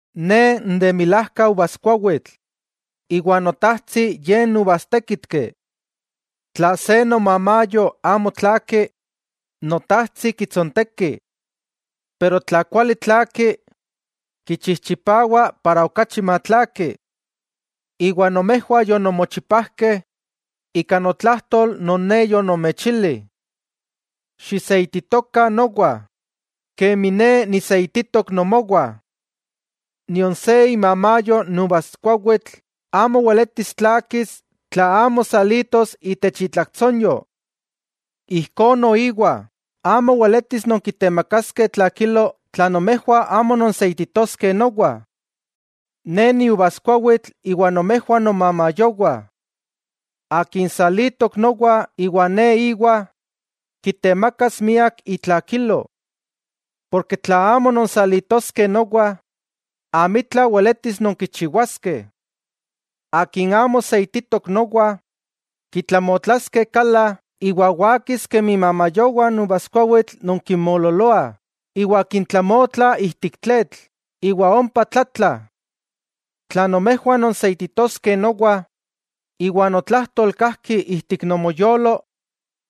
'Ne n de milajka uvaskuawitl, iwa Notajtsi Ye n uvastékitki. Tla se nomamayo amo tlaaki, Notajtsi kitsonteki. Pero tla kuali tlaaki kichijchipawa para okachi matlaaki. Nomejwah yononmochipajkeh, ika notlajtol non Ne yonomechili. Xiseititokah nowa, kemi Ne niseititok nomowah. Nion se imamayo n uvaskuawitl amo weletis tlaakis tla amo salitos itech itlaktsonyo. Ijkó noiwa, amo weletis nonkitemakaskeh tlakilo tla nomejwah amo nonseititoskeh nowa. 'Ne niuvaskuawitl iwa nomejwah nomamayowah. Akin salitok nowa iwa Ne íwa, kitemakas miak itlakilo. Porke tla amo nonsalitoskeh nowa, amitla weletis nonkichiwaskeh. Akin amo seititok nowa, kitlamotlaskeh kala iwa wakis kemi imamayowah n uvaskuawitl non kinmoololoah, iwa kintlamotla ijtik tletl iwa ompa tlatlah. 'Tla nomejwah nonseititoskeh nowa iwa notlajtol kajki ijtik nomoyolo,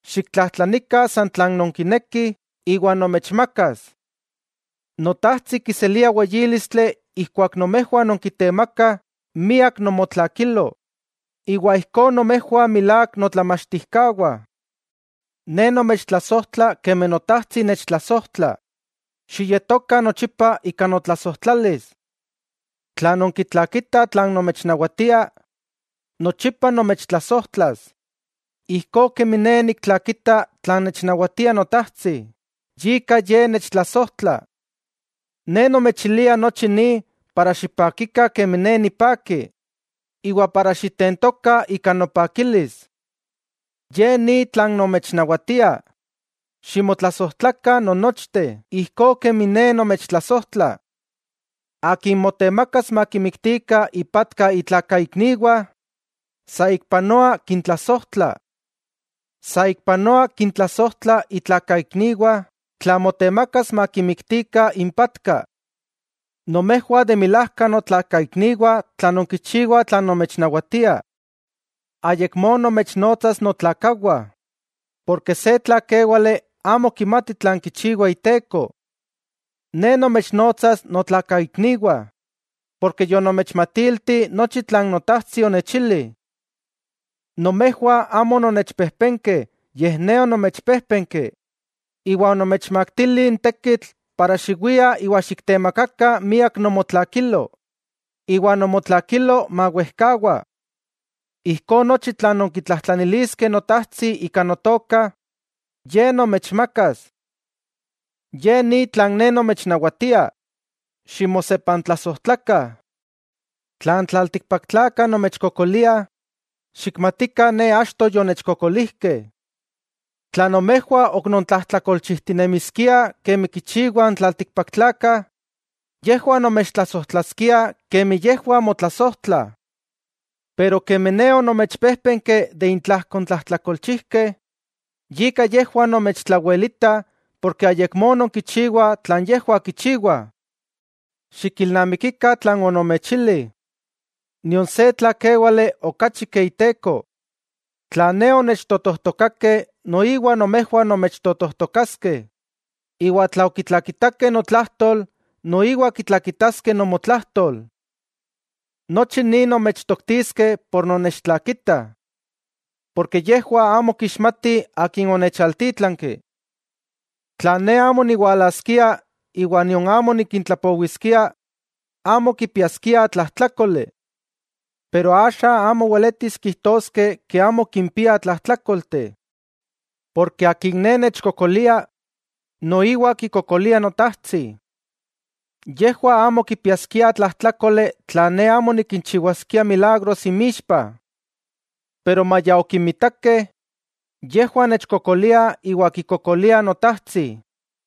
xiktlajtlanikah san tlan nonkinekih iwa nomechmakas. Notajtsi kiselia weyílistli ijkuak nomejwah nonkitemakah miak nomotlakilo, iwa ijkó mota nomejwah milák notlamachtijkawah. Ne nomechtlasojtla kemi Notajtsi nechtlasojtla, xiyetokah nochipa ika notlasojtlalis. Tla nonkitlakitah tlan nomechnawatia, nochipa nomechtlasojtlas, ijkó kemi Ne niktlakita tlan nechnawatia Notajtsi, yika Ye nechtlasojtla. 'Ne nomechilia nochi ni para xipakikah kemi Ne nipaki, iwa ijkó xitentokah ika nopakilis. Ye ni tlan nomechnawatia: Ximotlasojtlakah non nochteh ijkó kemi Ne nomechtlasojtla. Akin motemakas makimiktikah ipatka itlakaikniwah, saikpanoa kintlasojtla. Saikpanoa kintlasojtla itlakaikniwah tla motemakas makimiktikah impatka. Nomejwah de milajka notlakaikniwah tla nonkichiwah tlan nomechnawatia. Ayakmó nomechnotsas notlakawah, porke se tlakéwali amo kimati tlan kichiwa iteko. Ne nomechnotsas notlakaikniwah, porke yonomechmatilti nochi tlan Notajtsi onechili. 'Nomejwah amo ononnechpejpenkeh, yej Ne onomechpéjpenki, iwa onomechmaktili n tekitl para xiwiah iwa xiktemakakah miak nomotlakilo, iwa nomotlakilo mawejkawa. Ijkó nochi tlan nonkitlajtlaniliskeh Notajtsi ika Notoka, Ye nomechmakas. Ye ni tlan Ne nomechnawatia: Ximosepantlasojtlakah. 'Tla n tlaltikpaktlakah nomechkokoliah, xikmatikah Ne achto yonechkokolijkeh. Tla nomejwah ok nontlajtlakolchijtinemiskiah kemi kichiwah n tlaltikpaktlakah, yejwah nomechtlasojtlaskiah kemi yejwah motlasojtlah. Pero kemi Ne onomechpéjpenki de intlajko n tlajtlakolchijkeh, yika yejwah nomechtlawelitah porke ayakmó nonkichiwah tlan yejwah kichiwah. Xikilnamikikah tlan onomechili: “Nion se tlakéwali okachi ke iteko.” Tla Ne onechtotojtokakeh, noiwa nomejwah nomechtotojtokaskeh, iwa tla okitlakitakeh notlajtol, noiwa kitlakitaskeh nomotlajtol. Nochi ni nomechtoktiskeh por nonnechtlakitah. Porke yejwah amo kixmatih Akin onechaltítlanki. 'Tla Ne amo niwalaskia iwa nion amo nikintlapowiskia, amo kipiaskiah tlajtlákoli. Pero axa amo weletis kijtoskeh amo kimpiah tlajtlákolteh. Porke akin Ne nechkokolia, noiwa kikokolia Notajtsi. Yejwah amo kipiaskiah tlajtlákoli tla Ne amo nikinchiwaskia milagros inmixpa. Pero maya okimitakeh, yejwah nechkokoliah iwa kikokoliah Notajtsi.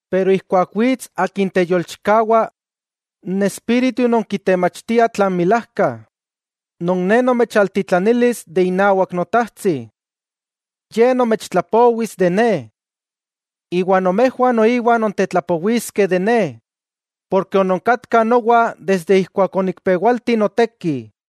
'Pero ijkuak wits Akin teyolchikawa, n Espíritu non kitemachtia tlan milajka, non Ne nomechtitlanilis de inawak Notajtsi. Ye nomechtlapowis de Ne. Iwa nomejwah noiwa nontetlapowiskeh de Ne, porke ononkatkah nowa ijkuak sikinika onikpewalti noteki.